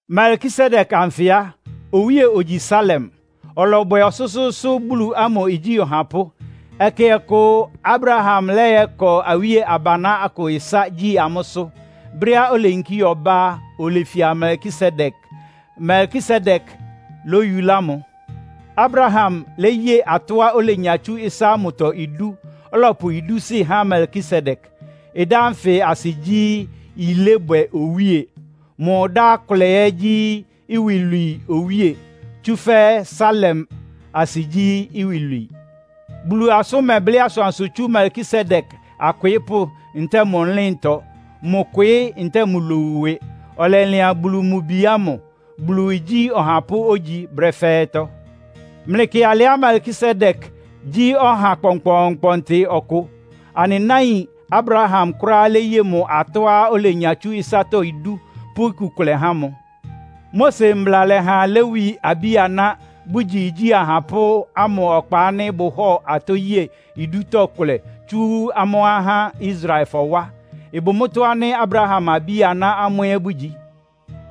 Melkisedek anfɩ á, owíe ogyi Salem. Ɔlɔbwɛ ɔsʋ́sʋ́ʋ́sʋ́ Bulu amʋ igyí ɔhapʋ́. Ɛkɛ ɔkʋ Abraham lɔ́yɔ́kɔ awíe abaná akʋ ɩsá, gyí amʋ́sʋ́. Brɛ́á oleyinkí ɔbá á, olefia Melkisedek. Melkisedek lóyulá mʋ. Abraham léye atɔ́á olenya tsú ɩsá ámʋtɔ idú, ɔlɔpʋ idúsɩ́ há Melkisedek. Ɩdá ánfɩ asɩ gyí, “Yilébwɛ Owíe.” Mʋ ɩdá kʋlɛ ɛ́ gyí “Iwilwii Owíe,” tsúfɛ́ Salem asɩ gyí, “Iwilwii.” Bulu asʋ́n mɛblɩ́ asʋansʋ tsú Melkisedek akwɩɩ́pʋ́ ntɛ́ɛ mʋ ɩlɩ́ntɔ, mʋ kwɩɩ́ ntɛ́ɛ mʋ lowu ɩwɩ. Ɔlɛlɩan Bulu mʋ Bi ámʋ. Bulu igyí ɔhapʋ́ ógyi brɛ́ fɛ́ɛ́tɔ́. Mlɩkɩ alɩá Melkisedek gyí ɔha kpɔnkpɔɔnkpɔntɩ ɔkʋ. Anɩ náin Abraham kʋ́ráá léye mʋ atɔ́á olenya tsú ɩsátɔ́ idú, pʋ́ iku kʋlɛ há mʋ. Mose Mbla lɛ́ha Lewi abí-aná, bʋgyi igyí ahapʋ́ ámʋ ɔkpa ánɩ́ bʋhɔ́ɔ atɔ́ yée idútɔ́ kʋlɛ tsu amʋ́ ahá Israelfɔ wá. Ɩbʋ mʋ́tɔ́ ánɩ́ Abraham abí-aná amʋ́ ɛ́ bʋgyi.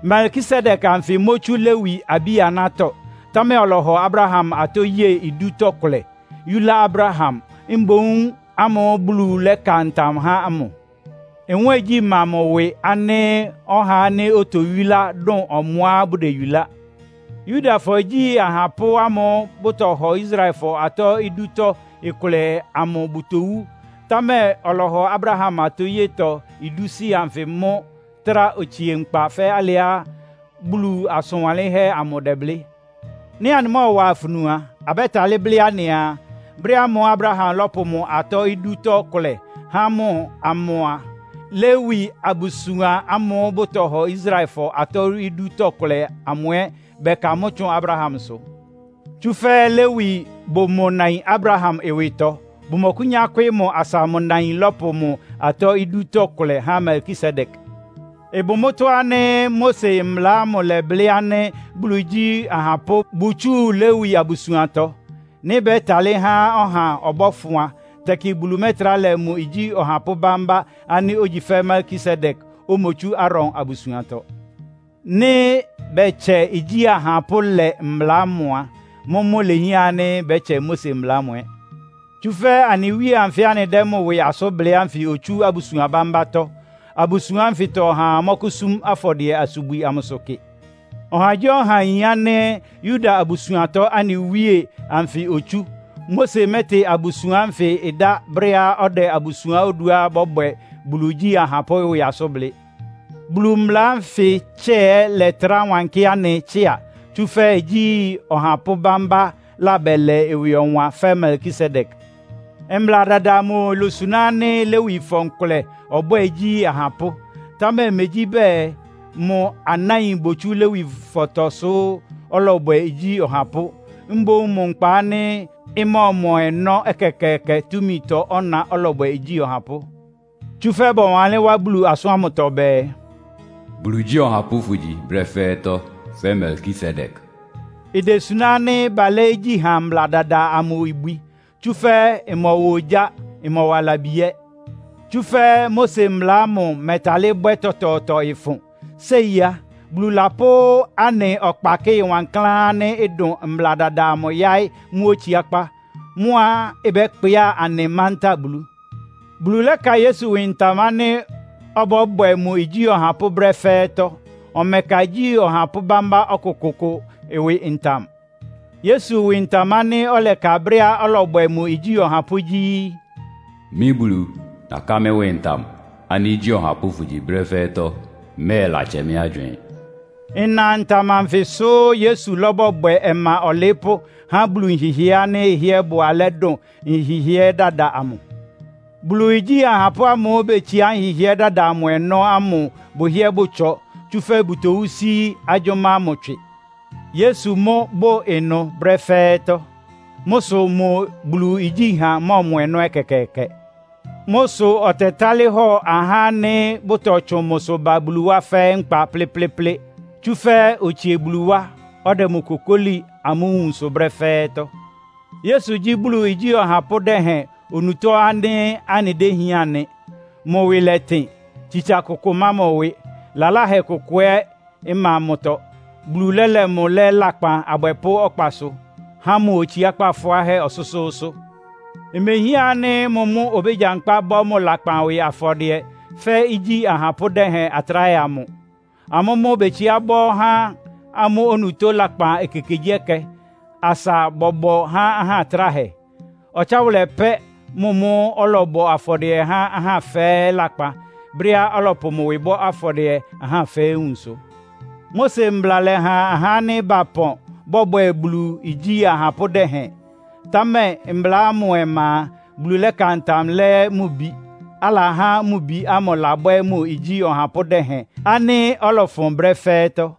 Melkisedek anfɩ mótsú Lewi abí-anátɔ́, támɛ ɔlɔhɔ Abraham atɔ́ yée idútɔ́ kʋlɛ, yúlá Abraham mboún ámʋ́ʋ́ Bulu lɛ́ka ntam há ámʋ. Nwɛ́ɛngyí ma mʋ́ ɩwɩ ánɩ́ ɔhá ánɩ́ otoyúlá dʋn ɔmʋá bʋdeyulá. Yudafɔ igyi ahapʋ́ ámʋ́ʋ́ bʋtɔhɔ Israelfɔ atɔ́ idútɔ́ kʋlɛ amʋ bʋtowú, támɛ ɔlɔhɔ Abraham atɔ́yetɔ idúsɩ́ anfɩ mʋ́ trá otsie nkpa fɛ́ alɩá Bulu asʋn wanlɩ́nhɛ́ amʋ dɛ́blɩ́. Nɩ́ anɩmɔ́ɔwa afunu a, abɛ́talɩ́ blɩ́ anɩaa, brɛ́ ámʋ́ʋ́ Abraham lɔ́pʋ mʋ atɔ́ idútɔ́ kʋlɛ há mʋ amʋ a, Lewi abusuan ámʋ́ʋ́ bʋtɔhɔ Israelfɔ atɔ́ idútɔ́ kʋlɛ amʋ ɛ́ bɛka mʋ́ tsʋn Abrahamsʋ. Tsúfɛ́ Lewi bʋ mʋ nain Abraham ɩwɩtɔ, bʋmɔkʋ́nyá kwɩ́ɩ́ mʋ asa mʋ nain lɔ́pʋ mʋ atɔ́ idútɔ́ kʋlɛ há Melkisedek. Ɩbʋ mʋ́tɔ́ ánɩ́ Mose mbla ámʋ lɛ́blɩ́ ánɩ́ Bulu igyí ahapʋ́ bʋtsúu Lewi abusuantɔ. Nɩ́ bɛ́talɩ́ há ɔha ɔbɔ́fʋn a, tɛkɩ Bulu mɛ́trá lɛ mʋ igyí ɔhapʋ́ bámbá ánɩ́ ogyi fɛ́ Melkisedek, omotsú Aaron abusuantɔ. Nɩ́ bɛtsɛ igyí ahapʋ́lɛ mbla ámʋ a, mʋ́mʋ́ ilehián ánɩ́ bɛ́tsɛ Mose mbla ámʋ ɛ́. Tsúfɛ́ anɩ Wíe anfɩ́ anɩdɛ́ mʋ ɩwɩ asʋ́n blɩ́ ánfɩ otsú abusuan bámbátɔ́. Abusuan ánfɩtɔ ɔhaa mɔ́kʋ́súm afɔdɩɛ-asubwi amʋsʋ kɩ. Ɔhagyíɔha yin ánɩ́ Yuda abusuantɔ anɩ Wíe anfɩ otsú. Mose mɛ́tɩ abusuan ánfɩ ɩdá brɛ́á ɔdɛ abusuan oduá bɔ́bwɛ Bulu igyí ahapʋ́ ɩwɩ asʋ́n blɩ́. Bulu mbla ánfɩ tsɛ́ɛ latráa wankɩ́ anɩ tsɩ́a, tsúfɛ́ igyí ɔhapʋ́ bámbá labɛlɛ ɩwɩ ɔwan fɛ́ Melkisedek. Mbla dada amʋ ilosuná ánɩ́ Lewifɔ nkʋlɛ ɔbwɛ́ɛ igyí ahapʋ́, támɛ megyí bɛɛ mʋ anáin botsú Lewifɔtɔ sʋ́ ɔlɔbwɛ igyí ɔhapʋ́. Mboún mʋ nkpa ánɩ́ ɩmɔ́ɔmɔ ɔnɔ́ ɛkɛkɛɛkɛ túmitɔ ɔ́na ɔlɔbwɛ igyí ɔhapʋ́. Tsúfɛ́ bɔwanlɩ́n wá Bulu asʋ́n ámʋtɔ bɛɛ, “Bulu igyí ɔhapʋ́ fʋ́gyi brɛ́ fɛ́ɛ́tɔ́, fɛ́ Melkisedek.” Idesuná ánɩ́ balɛ́ igyíha mbla dada amʋ ibwi, tsúfɛ́ ɩmɔwa ogyá, ɩmɔwa labi ɛ́. Tsúfɛ́ Mose mbla ámʋ mɛ́talɩ́ bwɛ́ tɔtɔɔtɔ ɩfʋn. Séi á, Bulu lapʋ́ anɩ ɔkpakɩ́ɩ wankláán ánɩ́ ɩdʋn mbla dada amʋ yáɩ́ mʋ́ otsiákpá. Mʋ́á ɩbɛ́kpɩá anɩ mantáa Bulu. Bulu lɛ́ka Yesu ɩwɩ ntam ánɩ́ ɔbɔ́bwɛ mʋ igyí ɔhapʋ́ brɛ́ fɛ́ɛ́tɔ́. Ɔmɛka igyí ɔhapʋ́ bámbá ɔkʋkʋʋkʋ ɩwɩ ntam. Yesu ɩwɩ ntam ánɩ́ ɔlɛka brɛ́á ɔlɔbwɛ mʋ igyí ɔhapʋ́ gyí, “Mɩ́ Bulu, naká mɩ́ ɩwɩ ntam ánɩ́ igyí ɔhapʋ́ fʋ́gyi brɛ́ fɛ́ɛ́tɔ́. Mmɛ́ɛlatsɛ mɩ́ agywɩɩn!” Ɩna ntam anfɩ sʋ Yesu labɔbwɛ ɔma ɔlɩɩ́pʋ́ há Bulu nhɩhɩɛ́ ánɩ́ ɩhɩ́ɛ́ bʋ alɛ́ dʋn nhɩhɩɛ́ dada amʋ. Bulu igyí ahapʋ́ ámʋ́ʋ́ betsiá nhɩhɩɛ́ dada amʋ ɔnɔ́ ámʋ bʋhɩ́ɛ́ bʋtsɔ, tsúfɛ́ bʋtowú sí agyʋ́má ámʋ tswɩ. Yesu mʋ́ bʋ ɩnʋ brɛ́ fɛ́ɛ́tɔ́. Mʋ́ sʋ mʋ Bulu igyíha mɔ́ɔmɔ ɔnɔ́ ɛkɛkɛɛkɛ. Mʋ́ sʋ ɔtɛtálɩ́ hɔ ahá ánɩ́ bʋtɔtsʋn mʋsʋ ba Bulu wá fɛ́ɛ́ nkpa plɩ́plɩ́plɩ́. Tsúfɛ́ otsie Bulu wá, ɔdɛ mʋ kokóli amʋ́ nwunsʋ brɛ́ fɛ́ɛ́tɔ́. Yesu gyí Bulu igyí ɔhapʋ́ dɛhɛn onutó ánɩ́ anɩdéhián nɩ. Mʋ ɩwɩ lɛtɩn, tsitsa kʋkʋ ɩma mʋ ɩwɩ. Lalahɛ kʋkʋʋkʋ ɛ́ ɩma mʋtɔ. Bulu lɛ́lɛ mʋ lɛ́ lakpan abwɛpʋ́ ɔkpasʋ, há mʋ otsiákpá fʋáhɛ́ ɔsʋ́sʋ́ʋ́sʋ́. Imehián ánɩ́ mʋ mʋ́ obégyankpá bɔ́ mʋ lakpan ɩwɩ afɔdɩɛ, fɛ́ igyi ahapʋ́ dɛhɛn atráhɛ amʋ. Amʋ́ mʋ́ betsiá bɔ́ há amʋ́ onutó lakpan ekekegyíɛkɛ, asa bɔbɔ há ahá atráhɛ. Ɔtsáwʋlɛ pɛ́ mʋ mʋ́ ɔlɔbɔ afɔdɩɛ há ahá fɛ́ɛ́ lakpan, brɛ́á ɔlɔpʋ mʋ ɩwɩ bɔ́ afɔdɩɛ ahá fɛ́ɛ́ nwunsʋ. Mose mbla lɛ́ha ahá ánɩ́ bapɔn bɔbwɛ Bulu igyí ahapʋ́ dɛhɛn. Támɛ mbla ámʋ ɔma a, Bulu lɛ́ka ntam lɛ́ mʋ Bi. Alahá mʋ Bi ámʋ labwɛ́ mʋ igyí ɔhapʋ́ dɛhɛn ánɩ́ ɔlɔfʋn brɛ́ fɛ́ɛ́tɔ́.